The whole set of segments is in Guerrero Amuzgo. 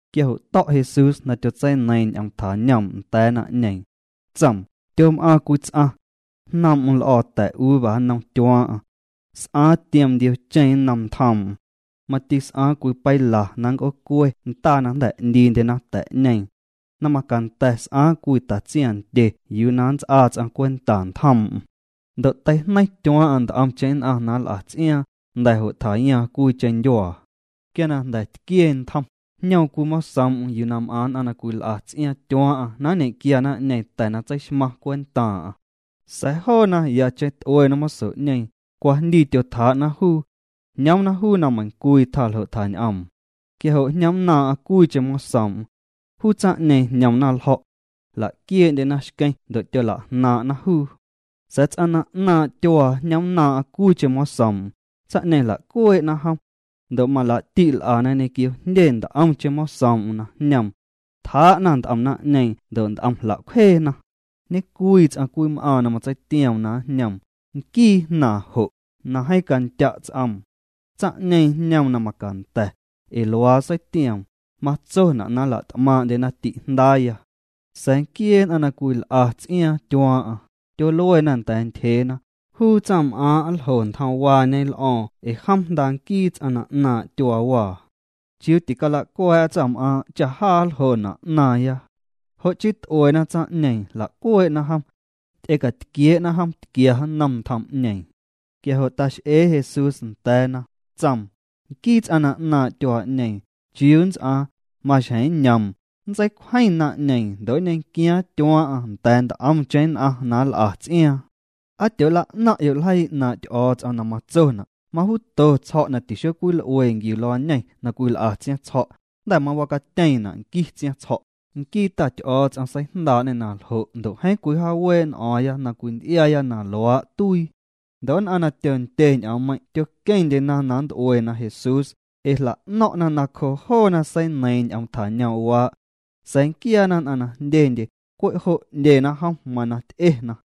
Quia jo' to̱' Jesús na tyotseineiiⁿ ñ'oom tjañoom' nda̱a̱ naⁿ'ñeeⁿ. Tsoom: —Tyom'aaⁿ cwii ts'aⁿ. Jnoom'm l'o̱o̱ ta̱uva nnom tyuaaⁿ'aⁿ. S'aaⁿ tiom ndiocheⁿ nnom ntjoom'm. Mati s'aaⁿ cwii peila na nnc'oocue ndaa na jnda̱ 'ndiindyena ta̱'ñeeⁿ. Na macanda̱ s'aaⁿ cwii tatsiaⁿndye yuu na nnts'aa ts'aⁿ cwenta ntjoom'm. ’Ndo' teijneiⁿ tyuaaⁿ'aⁿ nt'omcheⁿ nn'aⁿ na nl'a ts'iaaⁿ, jnda̱ jo' tjayaaⁿ cwiicheⁿ ndyuaa. Quia na jnda̱ tquie ntjom, jñoom cwii mosoom'm yuu m'aⁿ nn'aⁿ na cwil'a ts'iaaⁿ tyuaaⁿ'aⁿ na nñe'quia naⁿ'ñeeⁿ ta̱ na tseixmaⁿ cwentaaⁿ'aⁿ. Sa̱a̱ joona yacheⁿ t'uena moso'ñeeⁿ, cwajndii tyotjaa'na juu. Jñoomna juu na meiⁿcwii tjaa ljo' tjañ'oom. Quia jo' jñomnnaaⁿ'aⁿ cwiicheⁿ mosoom'm. Juu tsaⁿ'ñeeⁿ jñomna ljo̱'. Jla'quiee'ndyena xqueⁿ ndo' tyola'jnaaⁿ'na juu. Sa̱a̱ ts'aⁿ na 'naaⁿ' tyuaa jñomnnaaⁿ'aⁿ cwiicheⁿ mosoom'm, tsaⁿ'ñeeⁿ jla'cuee'na jom. Ndo' malaa'ti' l'ana ñequio jndye nt'omcheⁿ mosoom'm na jñoom. Tjaa'na nt'om naⁿ'ñeeⁿ ndo' nt'om jla'cwjeena. ’Ñecwii ts'aⁿ cwii m'aaⁿ na matseitioom na njñoom, nquii jnaaⁿ jo', na jeeⁿ candya' ts'oom. Tsaⁿ'ñeeⁿ jñoom na macanda̱, ee luaa seitioom: “Matsona' na nla't'maaⁿ'ndyena ti'jndaaya.” Sa̱a̱ nquiee nn'aⁿ na cwil'a ts'iaaⁿ tyuaaⁿ'aⁿ, tyoluena nda̱a̱ ntyjeena: “Juu tsaⁿm'aaⁿ' nljo ntjomwaañe l'o̱o̱ⁿ ee jom jnda nquii ts'aⁿ na 'naaⁿ' tyuaawaa. Chiuu ticala'cua̱a̱'a tsaⁿm'aaⁿ' cha jaa nljona' 'naaⁿya.” Jo' chii t'uena tsaⁿ'ñeeⁿ, jla'cuee'na jom. Ty'ecatquiee'na jom tquia nnom ntjom'ñeeⁿ. Quia jo' tax'ee Jesús nda̱a̱na, tsoom: —Nquii ts'aⁿ na 'naaⁿ' tyuaa'ñeeⁿ, ¿chiuu nnts'aaⁿ? Maxjeⁿ nñoom, nntseicwjeⁿ naⁿ'ñeeⁿ ndo' nñequiaaⁿ tyuaaⁿ'aⁿ nda̱a̱ nt'omcheⁿ nn'aⁿ na nl'a ts'iaaⁿ. ’¿Aa tyoola'naⁿ'yo' ljeii 'naaⁿ' Ty'o̱o̱ts'om na matsona': Majuuto tsjo̱' na tixocwil'ue nquiu luañeⁿ na cwil'a tsiaⁿtsjo̱', jnda̱ mawacatyeeⁿna' nqui tsiaⁿtsjo̱'? Nquii Ta Ty'o̱o̱ts'om seijndaa'ñê na ljo' ndo' jeeⁿ cwijaawee' n'o̱o̱ⁿya na cwinty'iaaya na luaa' tuii. Ndo' nn'aⁿ na tyondye ñ'oommeiⁿ' tyoqueⁿndyena na nnt'uena Jesús, ee jla'no̱ⁿ'na na cjoo joona seineiiⁿ ñ'oom tjañoom'waa'. Sa̱a̱ nquiaana nn'aⁿ na jndyendye, cwe' jo' 'ndyena jom, mana ty'ena.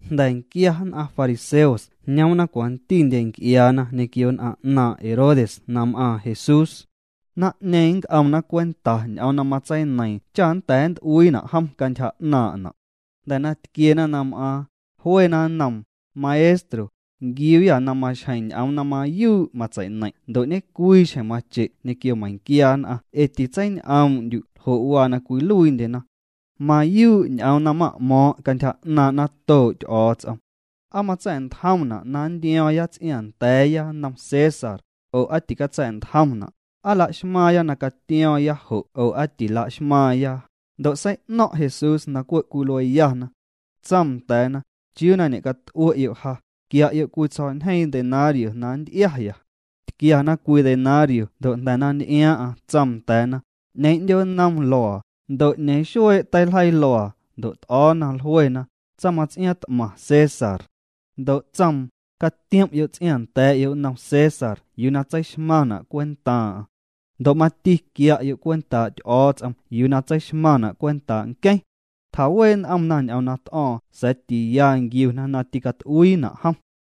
Jnda̱nquia nn'aⁿ fariseos jñoomna cwantindye nc'iaana ñequio nn'aⁿ 'naaⁿ' Herodes na m'aaⁿ Jesús. Naⁿ'ñeeⁿ nnc'omna cwenta ñ'oom na matseineiiⁿ cha nnda̱a̱ nnt'uiina' jom cantyja 'naaⁿ'na'. Jnda̱ na tquiena na m'aaⁿ, jluena nnoom: —Maestro, nquiuuyâ na maxjeⁿ ñ'oom na mayuu' matsei'neiⁿ' ndo' ñecwii xjeⁿ mache' ñequio meiⁿnquia nn'aⁿ ee titseiñ'oom'ndyu' ljo' waa na cwiluiindyena. Mayuu' ñ'oom na ma'mo̱o̱ⁿ' cantyja 'naaⁿ' natoo' Ty'o̱o̱ts'om. ¿Aa matsa̱'ntjomna' na nntio̱o̱ⁿya ts'iaaⁿnda̱a̱ya nnom César, oo aa ticatsa̱'ntjomna'? ¿Aa laxmaaⁿya na catio̱o̱ⁿya jo' oo aa ticalaxmaaⁿya? Ndo' sei'no̱ⁿ' Jesús na cwe' cwilueyana. Tsoom nda̱a̱na: —¿Chiuu na ñe'cat'ue'yo' ja? Quia'yo' cwii tsjo̱'ñjeeⁿ denario na nnty'iaya. Tquiana cwii denario ndo' jnda̱ na nty'iaaⁿ'aⁿ tsoom nda̱a̱na: —¿'Ñeeⁿ 'ndyoo nnom luaa? Ndo' ¿'ñeeⁿ xuee' teiljeii luaa? Ndo' t'o̱o̱na, jluena: —Tsaⁿmaⁿts'iaaⁿ t'maⁿ, César. Ndo' tsoom: —Catiom'yo' ts'iaaⁿnda̱a̱'yo' nnom César yuu na tseixmaⁿna' cwentaaⁿ'aⁿ. Ndo' mati quia'yo' cwentaa' Ty'o̱o̱ts'om yuu na tseixmaⁿna' cwentaa' nqueⁿ. Tjawee' n'omna ñ'oom na t'o̱o̱ⁿ sa̱a̱ tiya nquiuna na ticat'uiina' jom.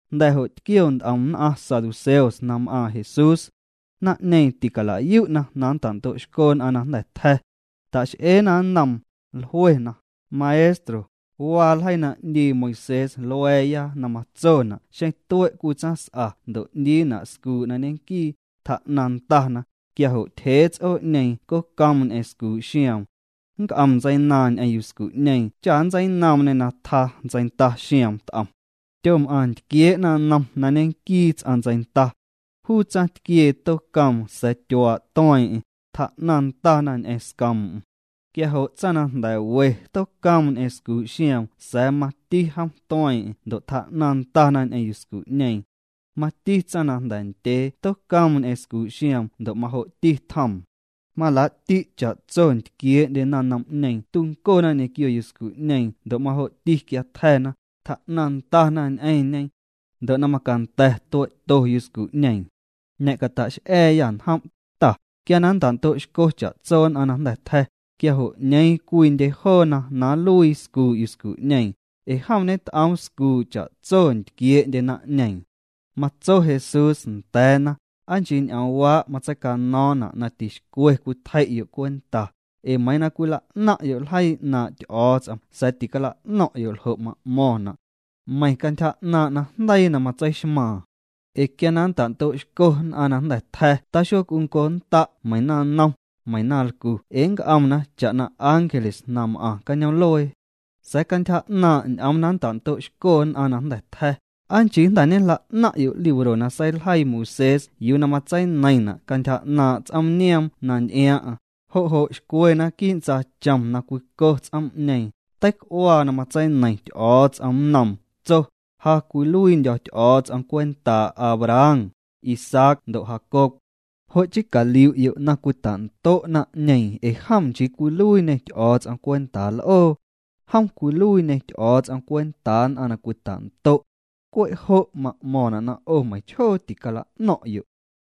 Jnda̱ jo' tquio nt'om nn'aⁿ saduceos na m'aaⁿ Jesús. Naⁿ'ñeeⁿ ticala'yu'na na nnta'ndo'xco nn'aⁿ na jnda̱ tja̱. Ta'x'eena nnoom, jluena: —Maestro, waa ljeii na 'ndii Moisés lua̱a̱ya na matsona' xeⁿ tue' cwii tsaⁿs'a ndo' 'ndiina' scuu' na ñenquii, tjaa'naⁿ ndana, quia jo' tyjee ts'oo'ñeeⁿ cocoom ñ'eⁿ scuu' xioom. Nnc'om ntseinaaⁿ ñ'eⁿ yuscu'ñeeⁿ cha nntseinoomñê na tjaa ntseinda xioom t'om. Tyom'aⁿ ntquiee' naⁿnom na ñenquii ts'aⁿ ntseinda. Juu tsaⁿtquiee tocoom sa̱a̱ tyuaa' tueeⁿ'eⁿ, tjaa'naⁿ ndana ñ'eⁿ scoom'm. Quia jo' tsaⁿ na jnda̱ we tocoom ñ'eⁿ scuu' xioom sa̱a̱ mati jom tueeⁿ'eⁿ ndo' tjaa'naⁿ ndana ñ'eⁿ yuscu'ñeeⁿ. Mati tsaⁿ na jnda̱ ndyee tocoom ñ'eⁿ scuu' xioom ndo' majo'ti tjoom. Malaa'ti' cha'tso ntquiee'ndye naⁿnom'ñeeⁿ tuncona ñequio yuscu'ñeeⁿ ndo' majo'ti quia tja̱na, tjaa'naⁿ ndana ñ'eⁿñe. Ndo' na macanda̱ tue'to yuscu'ñeeⁿ. Ñe'cata'x'a̱a̱yâ njom', Ta, quia na nnta'ndo'xco cha'tso nn'aⁿ na jnda̱ tja̱, quia jo' ¿'ñeeⁿ cwiindye joona na nluii scuu' yuscu'ñeeⁿ? Ee jom ñet'oom scuu cha'tso na ntquiee'ndye naⁿ'ñeeⁿ. Matso Jesús nda̱a̱na: —Aa nchii ñ'oomwaa' matseicano̱o̱ⁿna' na tixcwe cwitjei'yo' cwenta, ee meiiⁿ na cwila'naⁿ'yo' ljeii 'naaⁿ' Ty'o̱o̱ts'om sa̱a̱ ticala'no̱ⁿ'yo' ljo' ma'mo̱ⁿna'. Meiⁿ cantyja 'naaⁿ' najndeii na matseixmaaⁿ. Ee quia na nnta'ndo'xco nn'aⁿ na jnda̱ tja̱ taxoc'unconnda' meiⁿ naⁿnom, meiⁿ naⁿlcu ee nnc'omna cha'na ángeles na m'aⁿ cañoom'luee. Sa̱a̱ cantyja 'naaⁿ' ñ'oom na nnta'ndo'xco nn'aⁿ na jnda̱ tja̱, ¿aa chii jnda̱ ñejla'naⁿ'yo' libro na seiljeii Moisés yuu na matseineiⁿna' cantyja 'naaⁿ' ts'oom nioom na nty'iaaⁿ'aⁿ? Jo' jo' xcwe naquii' ntsaachom na cwico ts'oom'ñeeⁿ, teic'uaa na matseineiⁿ Ty'o̱o̱ts'om nnoom, tso: “Ja cwiluiindyo̱ Ty'o̱o̱ts'om cwentaa' Abraham, Isaac ndo' Jacob.” Jo' chii caliu'yo' na cwita'ndo' naⁿ'ñeeⁿ ee jom nchii cwiluiiñê Ty'o̱o̱ts'om cwentaa l'oo. Jom cwiluiiñê Ty'o̱o̱ts'om cwentaa nn'aⁿ na cwita'ndo'. Cwe' jo' ma'mo̱ⁿna' na 'o meiⁿchjoo ticala'no̱ⁿ'yo'.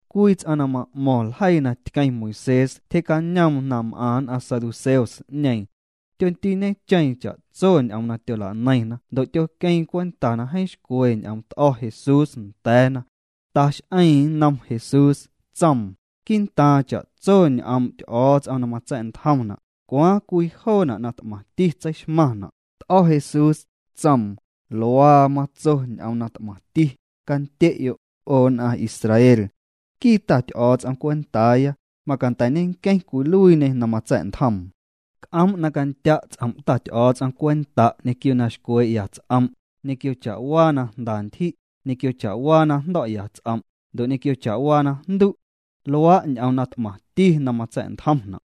Cwii ts'aⁿ na ma'mo̱ⁿ ljeii na tqueⁿ Moisés tyjee'cañoom na m'aⁿ nn'aⁿ saduceos'ñeeⁿ. Tyondiiñecheeⁿ cha'tso ñ'oom na tyola'neiⁿna ndo' tyoqueeⁿ cwenta na jeeⁿ xcwe ñ'oom t'o̱ Jesús nda̱a̱na. Tax'eeⁿ nnom Jesús, tsoom: —Quii'ntaaⁿ cha'tso ñ'oom' Ty'o̱o̱ts'om na matsa̱'ntjomna', ¿cwaaⁿ cwii joona' na t'maⁿti tseixmaⁿna'? T'o̱ Jesús, tsoom: —Luaa matso ñ'oom na t'maⁿti: “Candye'yo', 'o nn'aⁿ Israel. Nquii Ta Ty'o̱o̱ts'om cwentaaya, macanda̱ ñenqueⁿ cwiluiiñê na matsa̱'ntjoom. C'oom' na candya' ts'om' Ta Ty'o̱o̱ts'om cwenta' ñequio na xcwee'ya ts'om', ñequio cha'waa na jnda ntyji', ñequio cha'waa na jndo̱'ya ts'om', ndo' ñequio cha'waa najndu'.” Luaa' ñ'oom na t'maⁿti na matsa̱'ntjomna'.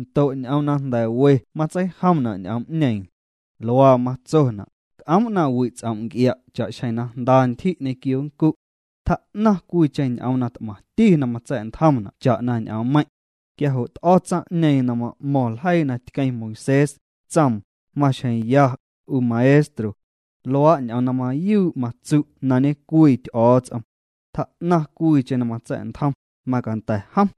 Ndo' ñ'oom na jnda̱ we matseijomna' ñ'oom'ñeeⁿ. Luaa matsona': “C'oom' na wi' ts'om' nc'ia' cha'xjeⁿ na jnda ntyji' ñequio nncu'. Tjaa'naⁿ cwiicheⁿ ñ'oom na t'maⁿti na matsa̱'ntjomna' cha'na ñ'oommeiⁿ'.” Quia jo' t'o̱ tsaⁿ'ñeeⁿ na ma'mo̱ⁿ ljeii na tqueⁿ Moisés, tsoom: —Maxjeⁿ ya, 'u Maestro. Luaa' ñ'oom na mayuu' matsu' na ñecwii Ty'o̱o̱ts'om. Tjaa'naⁿ cwiicheⁿ na matsa̱'ntjom, macanda̱ jom.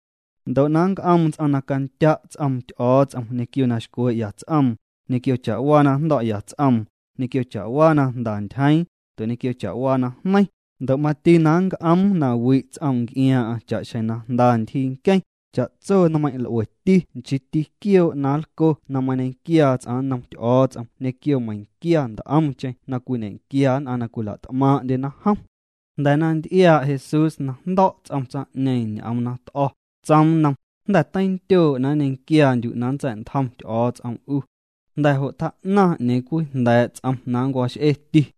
Ndo' na nnc'oom ts'aⁿ na candya' ts'oom Ty'o̱o̱ts'om ñequio na xcwee'ya ts'oom, ñequio cha'waa na jndo̱'ya ts'oom, ñequio cha'waa na jnda ntyjeeⁿ, ndo' ñequio cha'waa najneiⁿ, ndo' mati na nnc'oom na wi' ts'oom nc'iaaⁿ'aⁿ cha'xjeⁿ jnda ntyjii nqueⁿ, cha'tso nmeiⁿ' l'ueti nchiiti quioo' na nlco na mañequiaa ts'aⁿ nnom Ty'o̱o̱ts'om ñequio meiⁿnquia nt'omcheⁿ na cwiñe'quia nn'aⁿ na cwila't'maaⁿ'ndyena jom. Jnda̱ na nty'iaa' Jesús na jndo̱' ts'om tsaⁿ'ñeeⁿ ñ'oom na t'o̱, tsoom nnom: —Jnda̱ teindyoo' na nñequiaandyu' na nntsa̱'ntjom Ty'o̱o̱ts'om 'u. Jnda̱ jo' tjaa'naⁿ 'ñeeⁿ cwii jnda̱a̱' ts'om na nncwax'eti.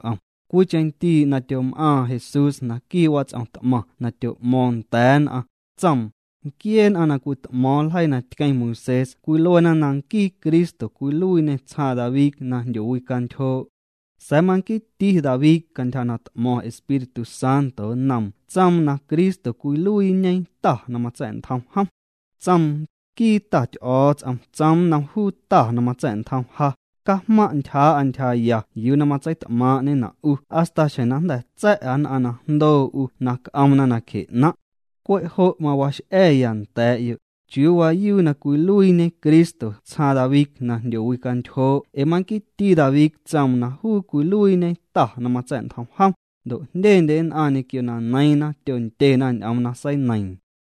Cwiicheⁿ ndii' na tyom'aaⁿ Jesús naquii' wats'om t'maⁿ na tyo'mo̱o̱ⁿ nda̱a̱ nn'aⁿ, tsoom: —Nquiee nn'aⁿ na cwit'mo̱o̱ⁿ ljeii na tqueⁿ Moisés cwiluena na nquii Cristo cwiluiiñê tsjaaⁿ David na jndyowicantyjoo'. Sa̱a̱ manquiiti David cantyja na t'mo̱ⁿ Espíritu Santo nnoom tsoom na Cristo cwiluiiñê Ta na matsa̱'ntjom jom. Tsoom: Nquii Ta Ty'o̱o̱ts'om tsoom nnom juu Ta na matsa̱'ntjom ja: “Cajmaⁿ' ntyjaa'a ntyjaya yuu na matseit'maaⁿ'ñena' 'u hasta xjeⁿ na jnda̱ tsa̱'a nn'aⁿ na jndoo 'u na c'omna nacje 'naⁿ'.” Cwe' jo' mawax'a̱a̱ya nda̱a̱'yo' ¿chiuu waayuu na cwiluiiñe Cristo tsjaaⁿ David na jndyowicantyjoo' ee manquiiti David tsoom na juu cwiluiiñe Ta na matsa̱'ntjom jom? Ndo' jndyendye nn'aⁿ ñequio na neiiⁿna tyondyena ñ'oom na seineiiⁿ.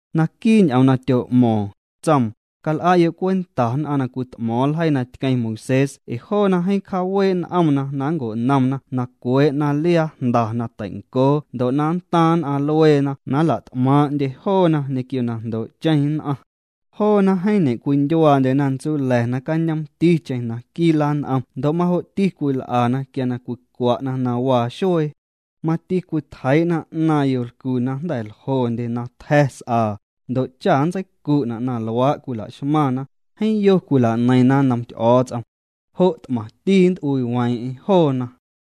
Naquii' ñ'oom na tyo'mo̱o̱ⁿ, tsoom: —Cal'a'yo' cwenta nn'aⁿ na cwit'mo̱o̱ⁿ ljeii na tqueⁿ Moisés ee joona jeeⁿ cjaawee' n'omna na nnco'nomna na cwee'na liaa jnda na tei'ncoo ndo' na nntaⁿ nn'aⁿ lueena na nla't'maaⁿ'ndye joona ñequio na jndoo'cheⁿ nn'aⁿ. Joona jeeⁿ ñe'cwindyuaandyena ntsula̱ nacañoomticheⁿ naquii' lan'om ndo' majo'ti cwil'ana quia na cwicwa'na na waa xuee. Mati cwitjeii'na 'naaⁿ yolcu na jnda̱ ljondye na tja̱ s'aa, ndo' cha nntseicu'na' na luaa' la'xmaⁿna, jeeⁿ yo cwila'neiⁿna nnom Ty'o̱o̱ts'om. Jo' t'maⁿti nnt'uiiweeⁿ'eⁿ joona.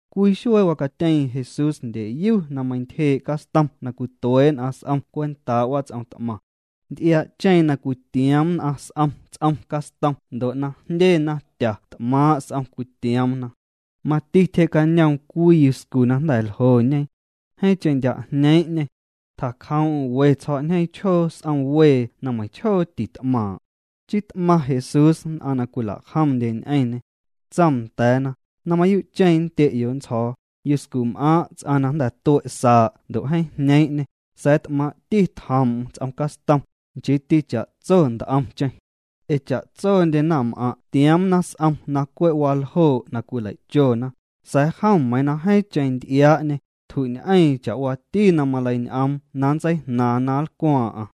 Cwii xuee wacatyeeⁿ Jesús ndyeyu na meintyjee' castom na cwituee' nn'aⁿ s'om cwentaa' wats'om t'maⁿ. Nty'iaa'cheeⁿ na cwitioom nn'aⁿ s'om ts'om castom ndo' na jndye naⁿtya t'maaⁿ' s'om cwitioomna. Mati tyje'cañoom cwii yuscu na jnda̱ ljoñe. Jeeⁿcheⁿ ndya' jñeeⁿ'ñê. Tjacjoom'm we tsjo̱'ñjeeⁿ chjoo s'om wee na meiⁿchjoo tit'maaⁿ'. Chii t'maⁿ Jesús nn'aⁿ na cwila'jomndye ñ'eⁿñê. Tsoom nda̱a̱na: —Na mayuu'cheⁿ nndye'yo' nntsjo̱o̱, yuscum'aaⁿ' ts'aⁿ na jnda̱ tue' saa' ndo' jeeⁿ jñeeⁿ'ñê, sa̱a̱ t'maaⁿ'ti tjoom'm ts'om castom, nchiiti cha'tso nt'omcheⁿ. Ee cha'tsondye naⁿm'aⁿ' tioomna s'om na cwe' waljoo' na cwilei'chona, sa̱a̱ jom meiiⁿ na jeeⁿcheⁿ nty'iaa'ñê, tju'ñ'eeⁿ cha'waati na maleiñ'oom na nntseijnaaⁿ na nlcwaaⁿ'aⁿ.